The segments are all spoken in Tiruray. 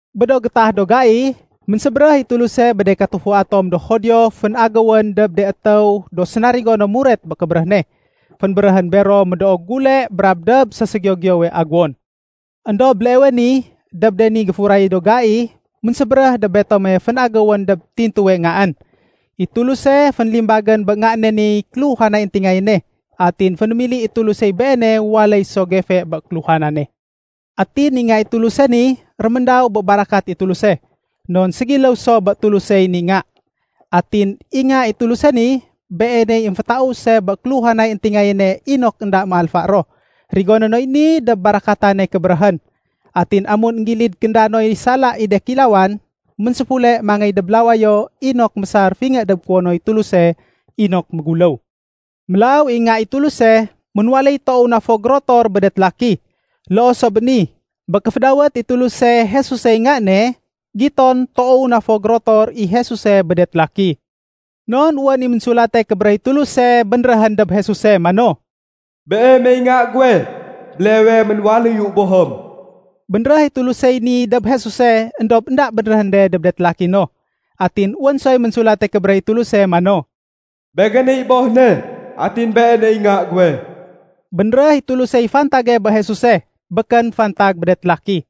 Bé do gétah do gai, ménsébéréh i Tuluse bé de katufua tom do Judio fénagéwén dob de étéw do sénarigo no muret bé kébéréh ne. Fénbéréhén bero médoo gule brab dob séségiyo-giyowe aguwon. Endob béleewe ni, dob de ni géfuray do gai, ménsébéréh dob betome fénagéwén dob tintuwe Ngaén. I Tuluse, fénlimbagén bé Nga ne niy kéluhanay éntingayéne, atin fénémili i Tulusey Beene waléy so gefe bé kéluhanane. Atin i Nga i Tuluse ni, réméndaw bé barakat i Tuluse, non ségiléw so bé Tulusey ni Nga. Atin i Nga i Tuluse ni, Beeney émfétause bé kéluhanay éntingayéne inok énda méalfa ro. Rigoné noy ni dob barakatane kébéréhén. Atin amun énggilid kénda noy sala i de kéilawan, ménséfule mangéy dob lawayo inok mésar fingé dob kuwonoy Tuluse inok méguléw. Mélaw i Nga i Tuluse, ménwaléy toow na fo gérotor bé de télaki. Loo so bé ni, bé kéfédawét i Tuluse Jesusey Nga ne, giton toow na fo gérotor i Jesuse bé de télaki. Non wén i Ménsulate Kébéréh i Tuluse bénréhén dob Jesuse mano, “Beemey Nga guwe, béleewe ménwaléyu Bohém.” Bénréh i Tulusey ni dob Jesuse, éndob énda bénréhén de dob de télaki no. Atin wén soy Ménsulate Kébéréh i Tuluse mano, “Begéney Boh ne, atin Beeney Nga guwe.” Bénréh i Tulusey fantage bé Jesuse, békén fantag bé de télaki.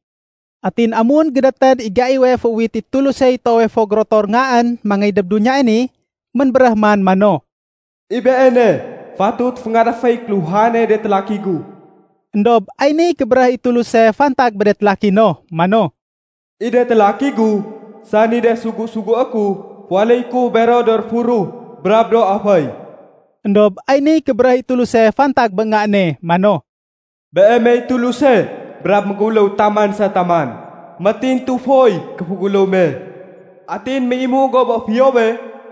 Atin amun gédétén i gaiwe féuwit i Tulusey toowe fo gérotor Ngaén mangéy dob duniyae ni, ménbéréh man mano, “I Beene, fatut féngadaféy kéluhanay de télaki gu.” Endob ay niy kébéréh i Tuluse fantag bé de télaki no mano, “I de télaki gu, sani de sugu-sugué ku, féwaléyé ku bero do réfuruh brab do aféy.” Endob ay niy kébéréh i Tuluse fantag bé Nga ne mano, “Beemey Tuluse brab méguléw taman sa taman. Métintu foy kéféguléw me. Atin méimu go bé fiyowe,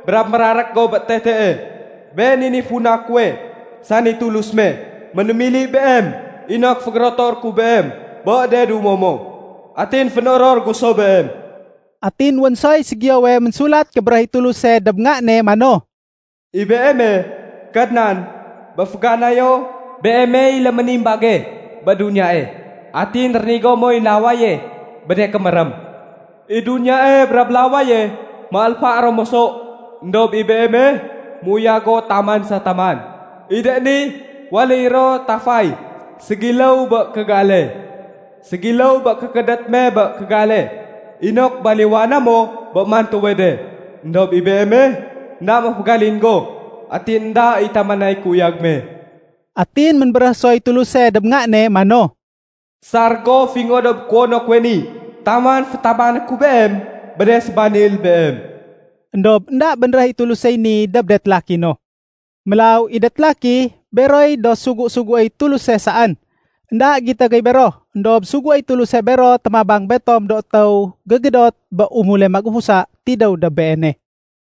brab mérarék go bé tetee. Been i niy funa kuwe, sani Tulus me, ménémili Beem inok fégérotoré ku Beem bé de dumo mo. Atin fénoror gu so beem.” Atin wén soy ségiyowe Ménsulat Kébéréh i Tuluse dob Nga ne mano, “I Beeme, Kadnan, bé féganayo Beemey léménimbage bé duniyae. Atin rénigo moy lawaye bé de kémérém. I duniyae brab lawaye, méalfa ro moso, éndob i Beeme, méuyag go taman sa taman. I de ni waléy ro tafay ségiléw bé kégale. Ségiléw bé kékédét me bé kégale inok baliwana mo bé mantuwe de. Endob i Beeme, énda méfégalin go, atin énda i tamanay kéuyag me.” Atin ménbéréh soy Tuluse dob Nga ne mano, “Sar go fingé dob kuwono kuwe ni taman fétabané ku Beem bé de sébanil Beem.” Endob énda bénréh i Tulusey ni dob de télaki no. Mélaw, i de télaki, beroy do sugu-suguéy Tuluse saén. Enda gito gey bero, éndob suguéy Tuluse bero témabang betom do étéw gégédot bé umule magufusa tidéw dob Beene.